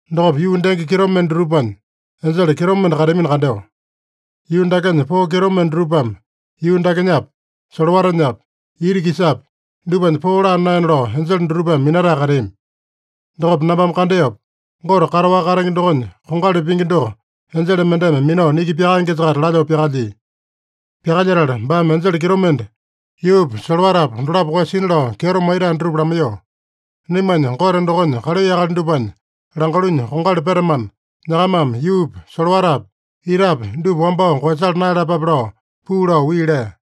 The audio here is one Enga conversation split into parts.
Dokopa yuu denge kitomende dutupanya enjele kitomende kateamino kandeo. Yuu dakenya poo kitomende dutupame yuu dakenyapi, solowatanyapi, ita-kisapi, dupanya poo laa naena lao enjele dutupame minatae kateami. Dokopa nambame kandeopa, Gote kataowaka katenge dokonya kongali pingi doko enjele mendeme minao niki pyakaengesa-kaita lalyoo pyakalyia. Pyakalyetala baame enjele kitomende yuupa, solowatapa dolapo koeyasina lao kyeto maitae dutupa lamaiyoo, “Naimanya Gote dokonya kalai akali dupanya langalunya kongali petamana, nyakamame yuupi, solowatapi, itapi dupa wambao koeyasala naeyalapape” lao puu lao wii lea.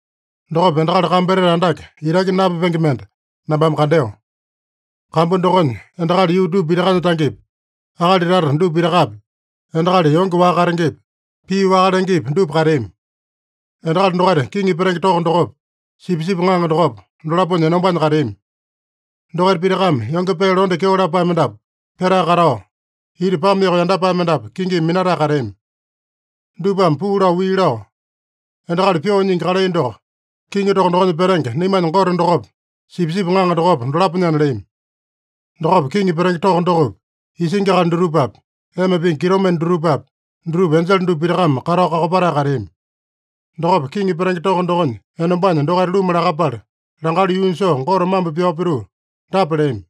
Dokopa endakali kambu etete andake, itaki napyapenge mende nambame kandeo. Kambu dokonya, endakali yuu dupa pitakanya tangepi, akali tata dupa pitakapi, endakali yonge waka katengepi, pii waka lengepi, dupa kateami. Endakali dokaita kiŋi petenge toko dokopa, Sipisipi Ŋaŋa dokopa, dolaponya enombanya kateami. Dokaita pitakame yonge pee londe kyeo lapae mendapu petae katao, ita pame yoko yandapae mendapu kingimi minatae kateami. Dupame puu lao wii lao, “Endakali pyoo nyingi kalai doko, kiŋi toko dokonya petenge naimanya Gote dokopa, Sipisipi Ŋaŋa dokopa, dolaponyana” leami. Dokopa kiŋi petenge toko dokopi, isingi akali dutupapi, ema pingi kitomende dutupapi, dutupa enjele dupa pitakame katao kakopatae kateami. Dokopa kiŋi petenge toko dokonya enombanya dokaita luma lakapala, langalu yuunya soo Gote mambo pyao pituu dapa leami: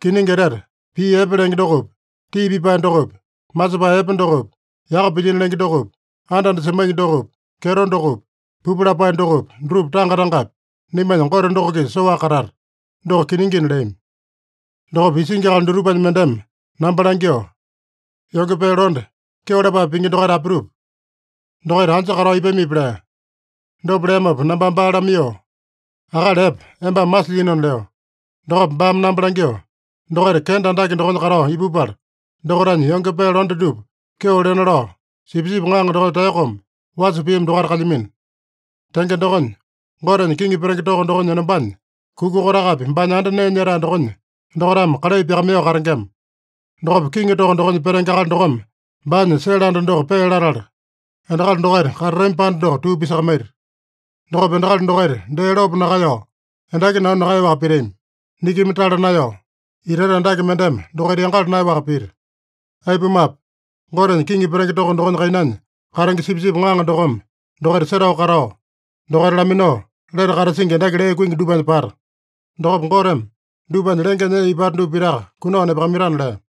“Kiningi etete, pii epe lenge dokopi, tii pipae dokopi, masepae epe dokopi, yaka pilyino lenge dokopi, anda-anda semaingi dokopi, kyeto dokopi, pupu lapae dokopi, dutupa tanga-tangapi naimanya Gote doko-kisa soaka katata. Doko kiningina” leami. Dokopa isingi akali dutupanya mendeme namba langyoo, “Yonge pee londe, kyeo lapae pingi dokaita apitupa? Dokaita anja katao ipamipi?” lea. Dopa leamopa nambame baa lamaiyoo, “Akali epe, embame masilyinona” leo. Dokopa baame namba langyoo, “Dokaita kenda andake dokonya katao ipupala, dokaitanya yonge pee londe dupa kyeo lena lao, Sipisipi Ŋaŋa dokonya taeyokome wasa piami dokaita kalyamino. Tenge dokonya, Gotenya kiŋi petenge toko dokonya enombanya kuka kotakapi baanya anda nee nyetae dokonya dokaitame kalai pyakamaiyoo katengema. Dokopa kiŋi toko dokonya petenge akali dokome baanya sele anda doko pee latala, endakali dokaita katatami panda doko tuu pisakamaita. Dokopa endakali dokaita dee lopo nakaeyao, endaki nanu nakaeyaowaka pitami. Nikimi tala naeyao, itaita andake mendeme dokaita yangala naeyaowaka pita. Aipumape, Gotenya kiŋi petenge toko dokonya kainanya katenge Sipisipi Ŋaŋa dokome dokaita setao katao, dokaita laminao lete katasingi endaki lee kuingi dupanya pata. Dokopa Goteme dupanya lengenya ee ipata dupa pitaka kunao nepakamaitana” lea.